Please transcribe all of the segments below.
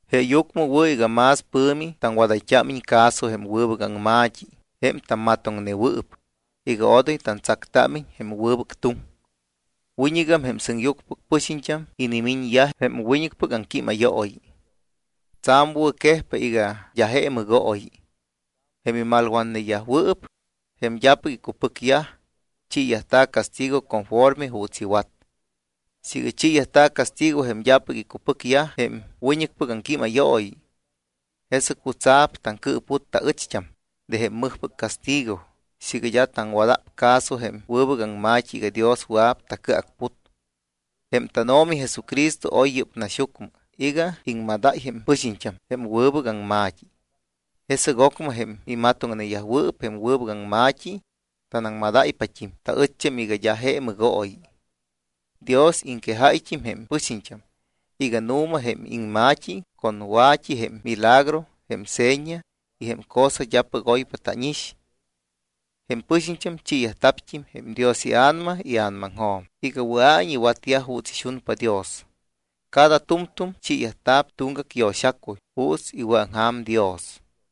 Jeeyucmɨ wɨ̱ iga más pɨ̱mi taŋwadayt́ámiñ caso jém wɨbɨc aŋma̱t́i jém tammatoŋnewɨɨp iga odoy tantsactámiñ jém wɨbɨc tuŋ. Wiñɨgam jém sɨŋyucmɨpɨc pɨxiñt́am inimiñyaj jém wiñɨcpɨc aŋquímayooyi. Tsa̱m wɨ̱quejpa iga d́a je mɨgooyi. Jém imalwatneyajwɨɨp, jém d́apɨc icupɨcyaj, chiiyajta̱ castigo conforme juuts iwat. Siiga chiiyajta̱ castigo jém d́apɨc icupɨcyaj jém wiñɨcpɨc aŋquímayooyi, ¿jesɨc jutsa̱p taŋcɨɨput taɨcht́am de jém mɨjpɨc castigo siiga d́a taŋwada̱p caso jém wɨbɨc aŋma̱t́i iga Dios wɨa̱p tacɨacput? Jém tánO̱mi Jesucristo oy yɨ́p naxyucmɨ iga iŋmadáy jém pɨxiñt́am jém wɨbɨc aŋma̱t́i. Jesɨc ocmɨ jém imatoŋneyajwɨɨp jém wɨbɨc aŋma̱t́i taŋmadáypat́im taɨcht́am iga d́a je mɨgooyi. Dios iŋquejáyt́im jém pɨxiñt́am iga nu̱ma jém iŋma̱t́i con wa̱t́i jém milagro, jém seña y jém cosa d́apɨc oypa tánix. Jém pɨxiñt́am chiiyajta̱t́im jém Dios iA̱nama ia̱namaŋjo̱m iga wɨa̱iñ iwatyaj juuts ixunpa Dios. Cada tu̱mtu̱m chiit́a̱p tuŋgac yo̱xacuy juuts iwɨ̱aŋja̱m Dios.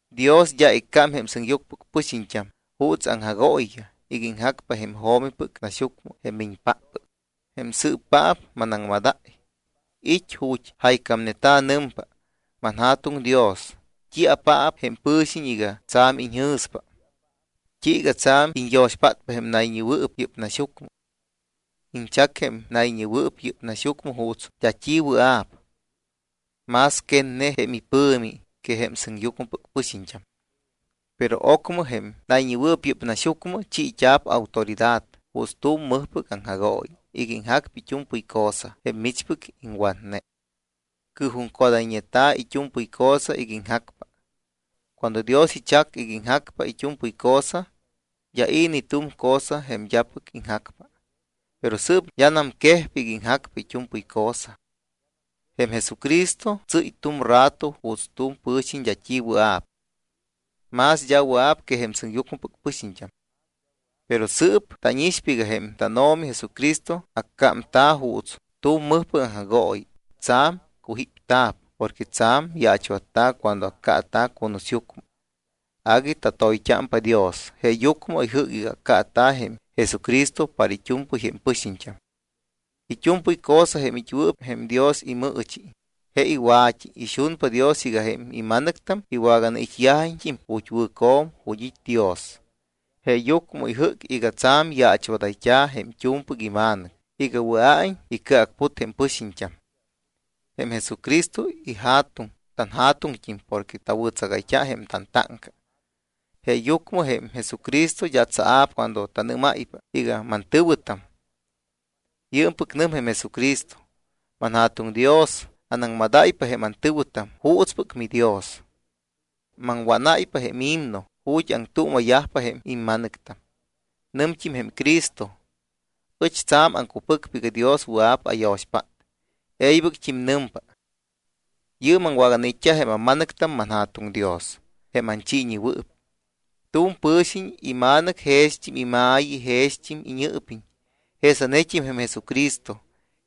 Dios d́a iccámpajém sɨŋyucmɨpɨc pɨxiñt́am juuts aŋjagooyiyaj iga iŋjacpa jém jo̱mipɨc naxyucmɨ jém miñpáppɨc, jém sɨɨpaap manaŋmadáy. It́ ju̱t́ jaycámneta̱, nɨmpa: ManJa̱tuŋ Dios, ¿t́iapaap jém pɨ̱xiñ iga tsa̱m iñjɨ̱spa? ¿T́iiga tsa̱m iñyo̱xpátpa jém nayñewɨɨp yɨ́p naxyucmɨ? Iñchac jém nayñewɨɨp yɨ́p naxyucmɨ juuts d́a t́i wɨa̱p, más quetne jém ipɨ̱mi que jém sɨŋyucmɨpɨc pɨxiñt́am. Pero ocmɨ jém nayñewɨɨp yɨ́p naxyucmɨ chiit́a̱p autoridad juuts tu̱m mɨjpɨc aŋjagooyi iga iŋjacpa it́u̱mpɨy cosa jém michpɨc iŋwatne. Cɨɨjuŋcodayñeta̱ it́u̱mpɨy cosa iga iŋjacpa. Cuando Dios ichac iga iŋjacpa it́u̱mpɨy cosa, d́a i̱ ni tu̱m cosa jém d́apɨc iŋjacpa. Pero sɨɨp d́anam quejpa iga iŋjacpa it́u̱mpɨy cosa. Jém Jesucristo tsɨ́y tu̱m rato juuts tu̱m pɨ̱xiñ d́a t́i wɨa̱p. Más d́a wɨa̱p que jém sɨŋyucmɨpɨc pɨxiñt́am. Pero sɨɨp tánixpa iga jém tánO̱mi Jesucristo accámta̱ juuts tu̱m mɨjpɨc aŋjagooyi, tsa̱m cujípta̱p porque tsa̱m yaachwatta̱ cuando accaata̱ cunusyucmɨ. Agui tatoyt́ámpa Dios, jeeyucmɨ ijɨ́c iga accaata̱ jém Jesucristo para it́u̱mpɨy jém pɨxiñt́am. It́u̱mpɨy cosa jém it́wɨɨp jém Dios imɨɨchi, je iwa̱t́i. Ixunpa Dios iga jém ima̱nɨctam iwaganait́yajiñt́im ju̱t́ wɨ̱co̱m, ju̱t́ it́ Dios. Jeeyucmɨ ijɨ́c iga tsa̱m yaachwadayt́a̱ jém t́u̱mpɨc iMa̱nɨc iga wɨa̱iñ icɨacput jém pɨxiñt́am. Jém Jesucristo iJa̱tuŋ tanJa̱tuŋt́im porque tawɨ̱tsagayt́a jém tantáŋca. Jeeyucmɨ jém Jesucristo d́a tsaa̱p cuando tanɨ́máypa iga: Mantɨ̱wɨtam. Yɨɨmpɨc nɨm jém Jesucristo: ManJa̱tuŋ Dios, anaŋmadáypa jém antɨ̱wɨtam juutspɨc miDios. Maŋwánáypa jém himno ju̱t́ aŋtuuma̱yajpa jém imma̱nɨctam. Nɨmt́im jém Cristo: Ɨch tsa̱m aŋcupɨcpa iga Dios wɨa̱p ayo̱xpát. E̱ybɨct́im nɨmpa: Yɨɨm aŋwaganait́t́a jém amma̱nɨctam, manJa̱tuŋ Dios, jém anchiiñewɨɨp. Tu̱m pɨ̱xiñ ima̱nɨctam jext́im ima̱yi y jext́im iñɨɨpiñ. Jesanet́im jém Jesucristo,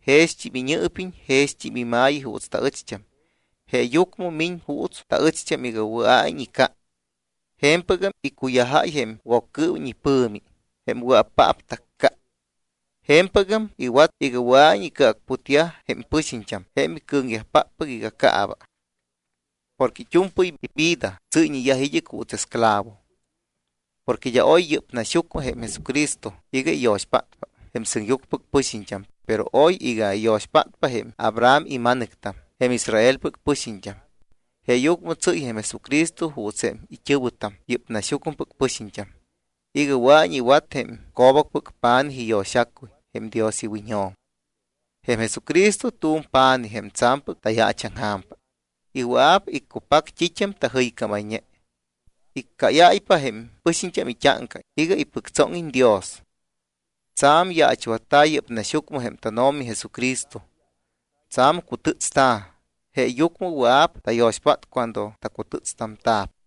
jext́im iñɨɨpiñ y jext́im ima̱yi juuts taɨcht́am. Jeeyucmɨ miñ juuts taɨcht́am iga wɨa̱iñ ica. Je̱mpɨgam iccuyajáy jém Woccɨɨwiñ ipɨ̱mi jém wɨa̱paap tacca. Je̱mpɨgam iwat iga wɨa̱iñ icɨacputyaj jém pɨxiñt́am jém icɨ̱ŋyajpáppɨc iga caaba, porque it́u̱mpɨy ivida tsɨ́yñeyaj id́ɨc juuts esclavo. Porque d́a oy yɨ́p naxyucmɨ jém Jesucristo iga iyo̱xpátpa jém sɨŋyucmɨpɨc pɨxiñt́am, pero oy iga iyo̱xpátpa jém Abraham ima̱nɨctam, jém Israelpɨc pɨxiñt́am. Jeeyucmɨ tsɨ́y jém Jesucristo juuts jém it́ɨ̱wɨtam, yɨ́p naxyucmɨpɨc pɨxiñt́am, iga wɨa̱iñ iwat jém co̱bacpɨc pa̱nij iyo̱xacuy jém Dios iwiñjo̱m. Jém Jesucristo tu̱m pa̱nij jém tsa̱mpɨc tayaachaŋja̱mpa y wɨa̱p iccupac t́it́am tajɨycámayñe. Iccáyáypa jém pɨxiñt́am it́áŋca iga ipɨctsóŋiñ Dios. Tsa̱m yaachwatta̱ yɨ́p naxyucmɨ jém tánO̱mi Jesucristo, tsa̱m cutɨ́tsta̱, jeeyucmɨ wɨa̱p tayo̱xpátta cuando tacutɨ́tstamta̱p.